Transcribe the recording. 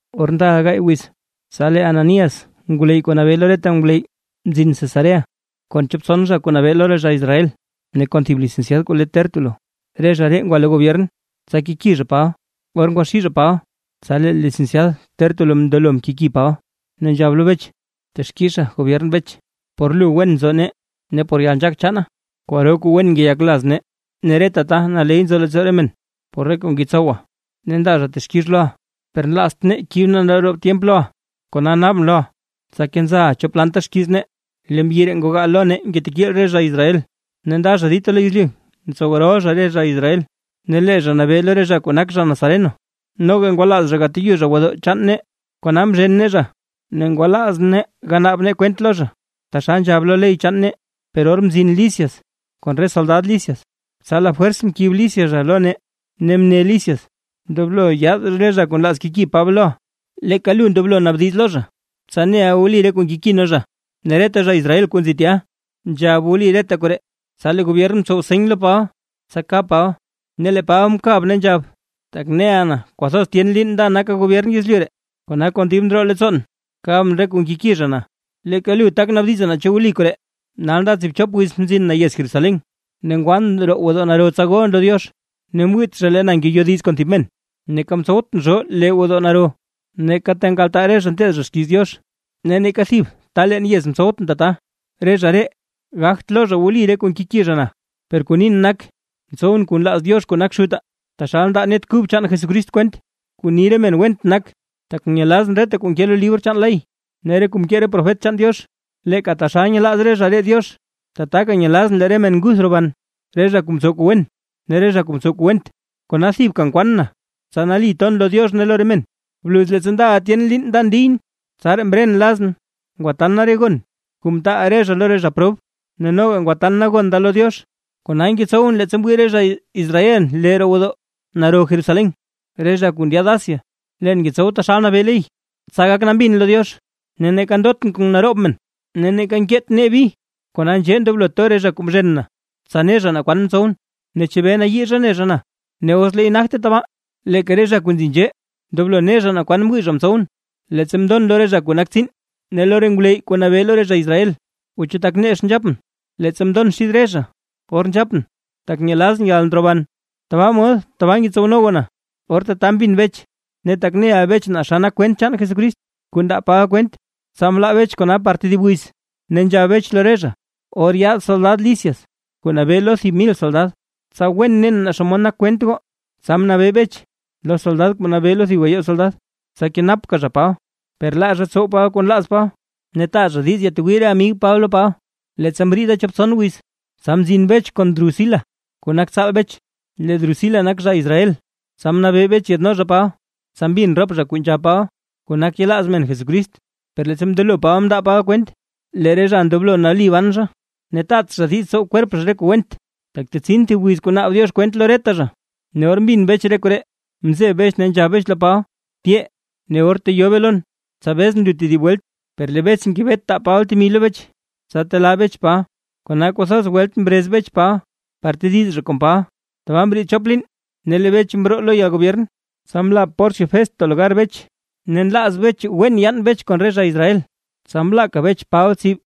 Or ndaʼa gaay wiz, tsa lee Ananías ngwleyy kuu nabee lo reta ngwleyy mzin Cesarea, kon chop tson zha kuu nabee lo re zha Israel, ne kon thib licenciad kuu le Tértulo. Re zha ree ngwa lo gobyern, tsa keki zha Paba. Or ngwaxii zha Paba, tsa lee licenciad Tértulo mndelo mkeki Paba, ne nzhab lo Bech: ―Texkixa gobyern Bech, por lu wen nzo nee ne por yalnzhaak chaana kwaro kuu wen ngeyak laz nee. Ne reta ta naley nzo leettsoo re men por re kuu ngetsowa ne ndaa zha texkix loʼa. Per nlazt nee kib nee naroob tyemp loʼa, kona naabʼn loʼa, tsa kenzaʼa chop lanta xkiiz nee. Lee mbyi ree ngogaa lo nee ngetekiil re zha Israel, ne nda zha dita lo yezlyu ntsow rol zha re zha Israel, ne lee zha nabee lo re zha kuu nak zha Nazareno. Noga ngwalaaz zha gateyu zha gwodoo chaan nee, kona mzhen nee zha ne ngwalaaz nee ganaab nee kwent lo zha taxal nzhab lo ley chaan nee. Per or mzin Lisias kon re soldad Lisias, tsa lafwers mkib Lisias zha lo nee ne mne Lisias: “Ndoblo yaad re zha kuu nlaaz keki Paba loʼa”. Leeka lu ndoblo naabdiz lo zha, tsa neʼa wli re kuu nkeki nee zha. Ne reta zha Israel kuu nzi tya, nzhab wli reta koree. Tsa lee gobyern mtsow seny lo Paba, tsa kab Paba, ne lee Paba mkab ne nzhab: ―Tak neʼa na kwathoz tyen liin nda naka gobyern yezlyu ree, kona kon dib ndroo leettsoon kabʼn re kuu nkeki zha na. Leeka lu tak naabdiza naa chu wli koree, nal nda tsiibchop wiz mzin na yez Jerusalén, ne ngwan roo gwodoo naro tsa golʼn lo Diox. Ne mwiit zha lee na ngeyodiz kon thib men, neeka mtsowtʼn zhoo lee roo gwodoo naro, neeka re ta nkaltaa re zha nteed zha xkiiz Diox ne neeka thib ta leen yez mtsowtʼn tata. Re zha ree gagt loo zha wli re kuu nkeki zha na loʼa. Per kuu nin nak, ntsowʼn kuu nlaaz Diox kuu nak Xutaa, taxal ndaa Net Kub chaan Jesús kwent, kuu ni re men went nak, tak nyelazʼn reta kuu nke lo libr chaan Ley ne re kuu mkee re profet chaan Diox. Leeka taxal nyelaaz re zha ree Diox, tataka nyelazʼn lee re men nguth roban, re zha kuu mtsow kuu wen ne re zha kuu mtsow kuu went. ’Kona thibka nkwaan na, tsa nali ton lo Diox ne lo re men. ’Bluz leettsa ndaʼa tyen liin nda ndiyʼn, tsaraa mren lazʼn, ngwatan na re gon kuu mtaal re zha lo re zha prob, ne noga ngwatan na gon da lo Diox. Kona ngetsow leettsa mwii re zha Israel na lee roo gwodoo naro Jerusalén, re zha kuu ndyaad Asia, leen ngetsow taxal nabee ley, tsa gak nambin lo Diox. Ne neeka ndotʼn kon naroob men neeka nkeet nee bi. Kona nzhee ndoblo to re zha kuu mzhen na, tsa ne zha naa kwan mtsowʼn ne chebee nayii zha ne zha na. Ne os leey nagte tabaa, leeka re zha kuu nzi nzhee ndoblo ne zha naa kwan mwii zha mtsowʼn, leettsa mndon lo re zha kuu nak tsiin ne lo re ngwleyy kuu nabee lo re zha Israel. O chu tak nex nzhapʼn, leettsa mndon xid re zha, or nzhapʼn: “Tak nyelazʼn yalndroban tabaa mod tabaa ngetsowno goo na”. Or tata mbin Bech, ne tak neʼa Bech naa xa nak kwent chaan Jesucrist kuu ndaa Paba kwent, tsa mlaa Bech kona par tedib wiz, ne nzhab Bech lo re zha: ―Or yaad soldad Lisias kuu nabee lo thib mil soldad, tsa ne wen nen naa xomod nak kwent goo. Tsa mnabee Bech, lo soldad kuu nabee lo thib gayoo soldad, tsa kenapka zha Paba, per laa zha tsow Paba kuu nlaaz Paba, ne taa zha diiz yatwii re amig Paba lo Paba. Leettsa mriida chop tson wiz, tsa mzin Bech kon Drusila kuu nak tsaal Bech, lee Drusila nak zha Israel, tsa mnabee Bech yaadno zha Paba, tsa mbin rop zha kuu nzhab Paba, kuu nak yelaaz men Jesucrist. Per leettsa mndelo Paba mndaa Paba kwent, lee re zha ndoblo nali ban zha, ne taat zha diiz tsow kwerp zha re kuu went, tak tetsin thib wiz kuu naab Diox kwent lo reta zha, ne or mbin Bech re koree, mzeb Bech ne nzhab Bech lo Paba: ―Tyee ne or teyobe lon, tsa bezʼn lu tedib welt. Per lee Bech ngebet taa Paba temi lo Bech, tsa telaa Bech Paba, kona kwathoz welt mrez Bech Paba par tediz zha kon Paba. Tbaa mriid chop liin ne lee Bech mroo lo yalgobyern, tsa mla Porcio Festo lugar Bech. Ne nlaaz Bech wen yaan Bech kon re zha Israel, tsa mlaaka Bech Paba tsib.